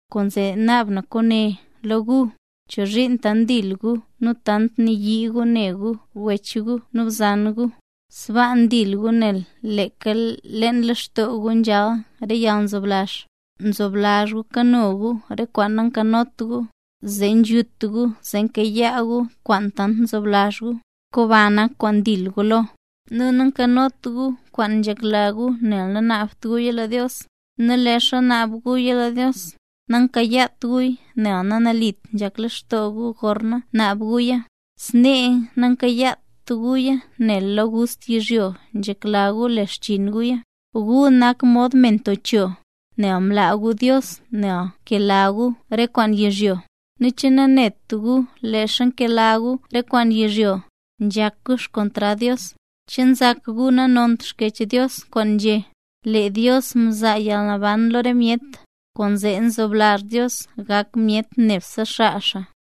Kwaanzee naab na kwaane lo gu. ¿Chozhiin tant ndil gu nu tant nayii gu ne gu re wech gu nu re bzan gu? Sbaa ndil gu nel leeka leen lextoo gu nzhal re yalnzoblazh. Nzoblazh gu kano gu re kwaan nankanot gu, zee nzhut gu zee nkayaa gu kwaan tant nzoblazh gu, nu komba nak kwaan ndil gu lo. Nu nankanot gu kwaan nzhekla gu nel nanaabt guya lo Dios. Nu leezha naab guya lo Dios, nankayaat guya nel nanalit nzhak lextoo gu gorna ngunaab guya. Snee nankayaat guya nel lo gust yizhyo nzhekla gu le xchiin guya. Gu nak mod me nto cho, nel mlaa gu Dios nel nkela gu re kwaan yizhyo. ¿Che nanet gu leezha nkela gu re kwaan yizhyo, nzhak gu xkontrad Dios? ¿Che nzak gu nanont Xkyech Dios kwaan nzhé: “Lee Dios mzaa yalnaban lo re myet, kwaanzee nzoblazh Dios gak myet nebse xaa xaa”?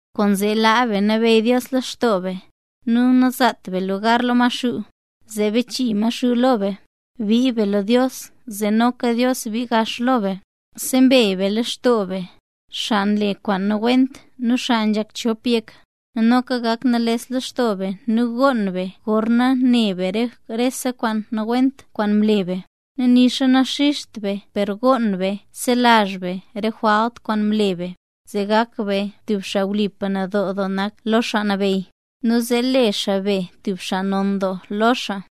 Kwaanzee laa be nabeyy Dios lextoo be, nu nazaat be lugar lo Maxuu, zee bachii Maxuu lo be. Bii be lo Dios zee noka Dios bii gax lo be. Sembey be lextoo be, xaa nle kwaan nawent nu xaa nzhak chop yek. Nu noka gak nales lextoo be nu goon be gorna ne be lo rese kwaan nawent kwaan mle be. Nu nixa naxizht be per goon be selazh be re jwalt kwaan mle be. Zee gak be tub xaa wlipa nadoo doo nak lo Xaa Nabeyy, nu zee le xaa be tub xaa non doo lo xaa.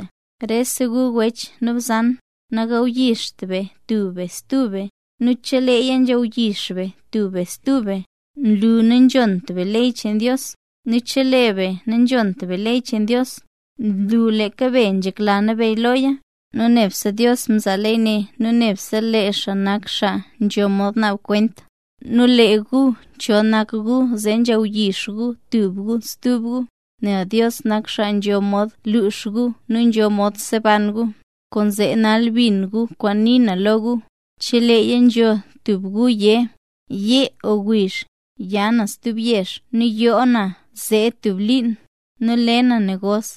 Rese gu wech nu bzan, nagawyixt be tub be stub be. Nu cheleeya nzhawyix be tub be stub be, nlu nanzhont be ley cheen Dios. Nu chelee be nanzhont be ley cheen Dios, nlu leeka be nzhekla nabeyy loya. Nu nebse Dios mzaa ley ne nu nebse lee xaa nak xaa nzho mod naab re kwent. Nu lee gu, ¿cho nak gu zee nzhawyix gu tub gu stub gu? Nel Dios nak xaa nzho mod luux gu nu nzho mod seban gu. Kwaanzee nal bin gu kwaan nii na lo gu. Cheleeya nzho tub be yé: “Yee o wiizh, ya na stub yezh nu yoo na zee tub liin, zee le na negos,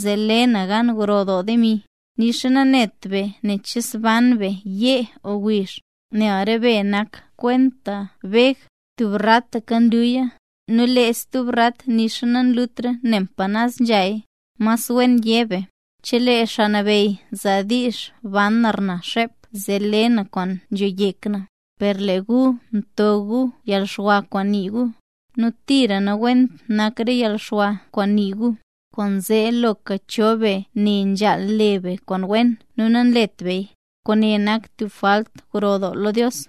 zee le na gan gro doo demi”. Nu nixa nanet be nen che zban be yee o wiizh. Nel re be nak kwenta beg; tub rataka nluya, nu lee stub rat nixa nanlutra nen pa naz nzhaya. Mas wen yé be: “Chelee Xaa Nabeyy zaa diizh banra na xep zee le na kwaan nzho yek na”. Per lee gu nto doo gu yalxwa kwaan nii gu, nu tira nawent nak re yalxwa kwaan nii gu. Kwaanzee loka cho be ne nzhaal le be kwaan wen nu nalet beya, kwaane nak tub jwalt gro doo lo Dios.